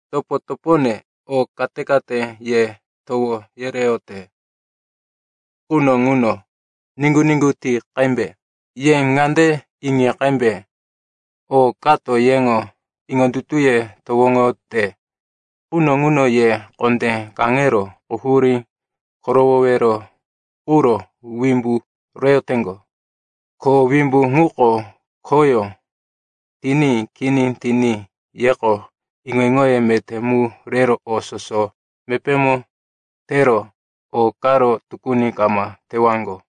Topo-topone, o kate-kate ye towo yereyote quno ŋuno niŋgu-niŋgu ti qembe. Ye ŋande iŋi qembe, o kato yeŋo iŋondutuye towoŋote quno ŋuno ye kondé kaŋero quhurí korowowero quro wimbu reyoteŋgo. Ko wimbu ŋuko khoyó tiní kini tiní yeko iŋo-iŋoye meté mu rero o soso mepémo tero o karo tukuni kama tewaŋgo.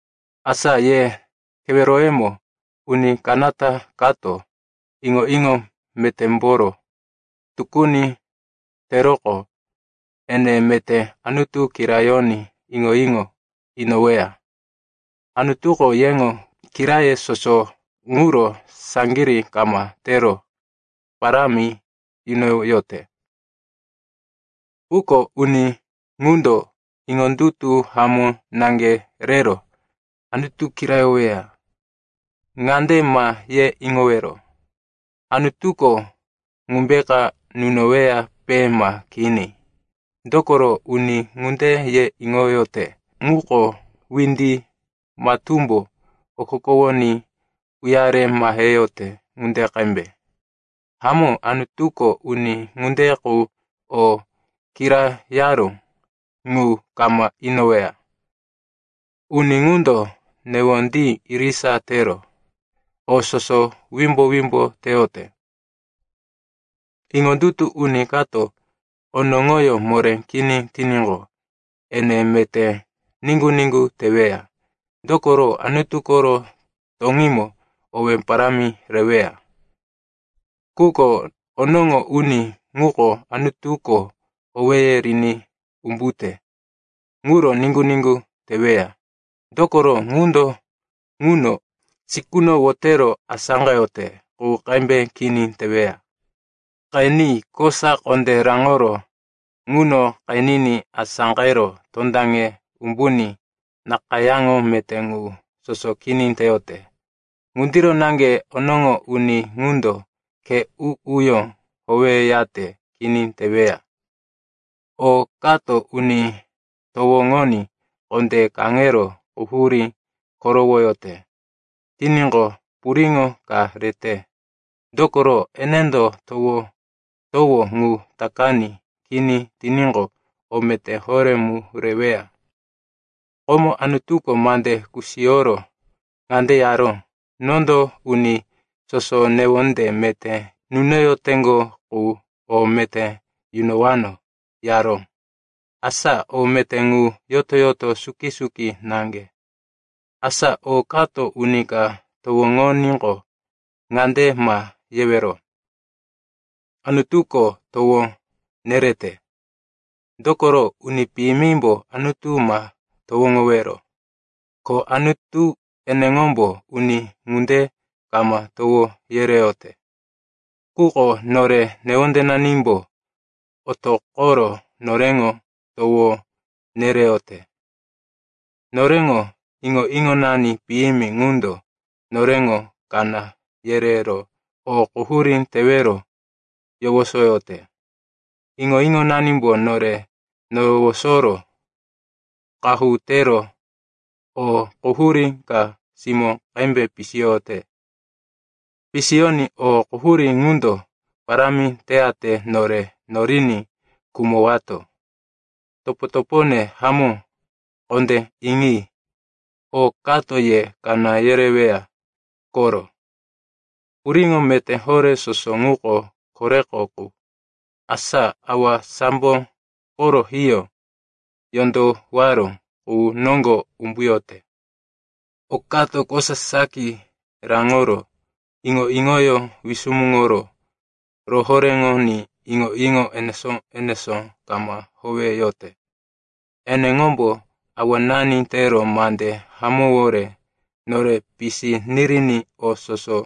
Asa ye keweroyemo uni kanata kato iŋo-iŋo metémboro tukuni teroqo, ene meté Anutu kirayoní iŋo-iŋo inoweya. Anutuko yeŋo kiraye soso ŋuro saŋgirí kama tero parámi yunoyote. Quko uni ŋundo iŋondutu hamó naŋge rero Anutu kirayoweya. Ŋande ma ye iŋowero, “Anutuko ŋumbeka nunoweyape ma kini?” Dokoro uni ŋunde ye iŋoyote ŋuko windi matúmbo okokowoní uyare maheyote ŋunde qembe. Hamó, Anutuko uni ŋunde qu o kirayaró ŋu kama inoweya. Uni ŋundo newondí irisa tero, o soso wimbo-wimbo teyote. Iŋondutu uni kato onoŋoyó moré kini tiníqo, ene meté niŋgu-niŋgu teweya, dokoro Anutu koro toŋímo owé parámi reweya. Quko onoŋo uni ŋuko Anutuko owéye riní umbute ŋuro niŋgu-niŋgu teweya. Dokoro ŋundo nuŋo sikuno wotero asáqeyote qu qembe kini teweya. Qeni, kosa kondé raŋoro nuŋo qeniní asáqero tondaŋe umbuní nakayáŋo meté ŋu soso kini teyote. Ŋundiro naŋge onoŋo uni ŋundo khe u-uyó howeyate kini teweya. O kato uni towoŋoní kondé kaŋero quhurí korowoyote tiníqo, puriŋo ka rete. Dokoro enendo towo-towo ŋu takaní kini tiníqo, o meté horé mu reweya. Komo Anutuko mande kusiyoro ŋande yaró, “Nondo uni soso newonde meté nunoyoteŋgo qu o meté yunowano,” yaró. Asa o meté ŋu yoto-yoto suki-suki naŋge. Asa o kato uni ka towoŋoníqo, ŋande ma yewero, “Anutuko towo nerete.” Dokoro uni piyimimbo Anutu ma towoŋowero, ko Anutu eneŋombo uni ŋunde kama towo yereyote. Quko nore newondenanimbo otoqoro noreŋo towo nereyote. Noreŋo iŋo-iŋonani piyimi ŋundo noreŋo kaná yerero o quhurí tewero yowosoyote. Iŋo-iŋonanimbo nore nowosoro qahu tero o quhurí ka simó qembe pisiyote. Pisiyoní o quhurí ŋundo parámi teyate nore noriní khumowato. Topo-topone hamó, kondé iŋi. O kato ye kaná yereweya koro. Puriŋo meté horé soso ŋuko koreko qu, asa Awa sambo koro hiyó yondowaró qu noŋgo umbuyote. O kato kosa saki raŋoro iŋo-iŋoyó wisumuŋoro rohoréŋoní iŋo-iŋo enesó-enesó kama howeyote. Eneŋombo awanani tero mande hamówore nore pisi niriní o soso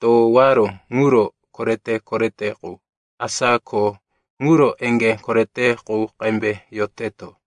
towaró ŋuro korete-korete qu, asa kho ŋuro eŋgé korete qu qembe yoteto.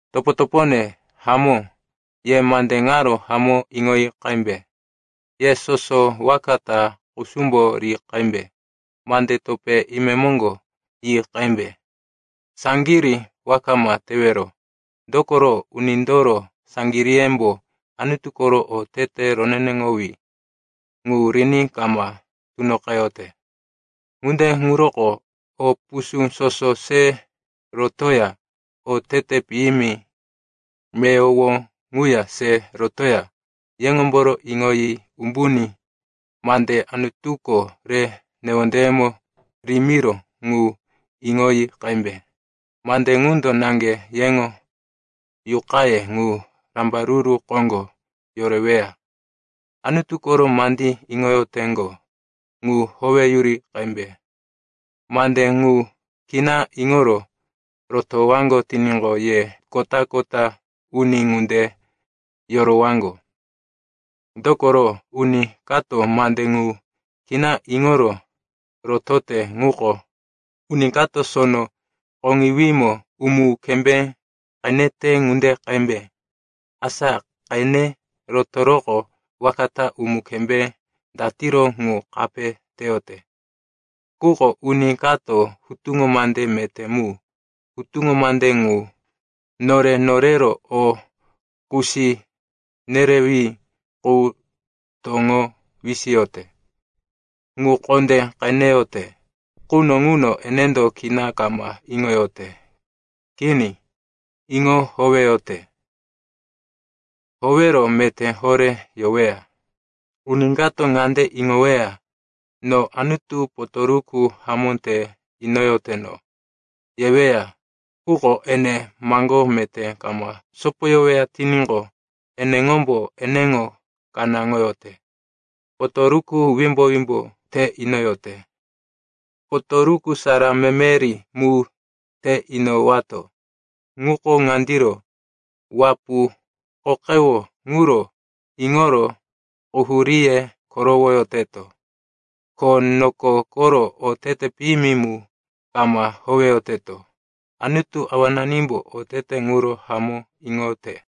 Topo-topone hamó, ye mande ŋaro hamó iŋoyi qembe. Ye soso waka ta kusumbo ri qembe, mande topé imemoŋgo yi qembe, saŋgirí waka ma tewero. Dokoro unindoro saŋgiríyembo Anutu koro otete roneneŋowí ŋu riní kama tunoqeyote. Ŋunde ŋuroko o pusú soso se rotoya otete piyimi meyowo ŋuya se rotoya yeŋomboro iŋoyi umbuní mande Anutuko re newondeyemo rimiró ŋu iŋoyi qembe. Mande ŋundo naŋge yeŋo yuqaye ŋu rambaruru koŋgo yoreweya. Anutu koro mandí iŋoyoteŋgo ŋu howeyuri qembe. Mande ŋu kina iŋoro rotowaŋgo tiníqo, ye kota-kota uni ŋunde yorowaŋgo. Dokoro uni kato mande ŋu kina iŋoro rotote ŋuko uni kato sono koŋiwímo umu-kembé qenete ŋunde qembe. Asa qene rotoroqo waka ta umu-kembé datiro ŋu kape teyote. Quko uni kato hutuŋo mande meté mu, hutuŋo mande ŋu nore norero o kusi nerewí qu toŋo wisiyote, ŋu kondé qeneyote quno ŋuno, enendo kina kama iŋoyote. Kini, iŋo howeyote. Howero meté horé yoweya. Uni kato ŋande iŋoweya, “No Anutu potoruku hamó te inoyoteno,” yeweya, quko ene maŋgó meté kama sopoyoweya tiníqo, eneŋombo eneŋo kanáŋoyote, potoruku wimbo-wimbo te inoyote. Potoruku sara memeri mu te inowato ŋuko ŋandiro: wapu, qoqewo ŋuro iŋoro quhuríye korowoyoteto. Ko noko koro otete piyimi mu kama howeyoteto. Anutu Awananimbo otete ŋuro hamó iŋote.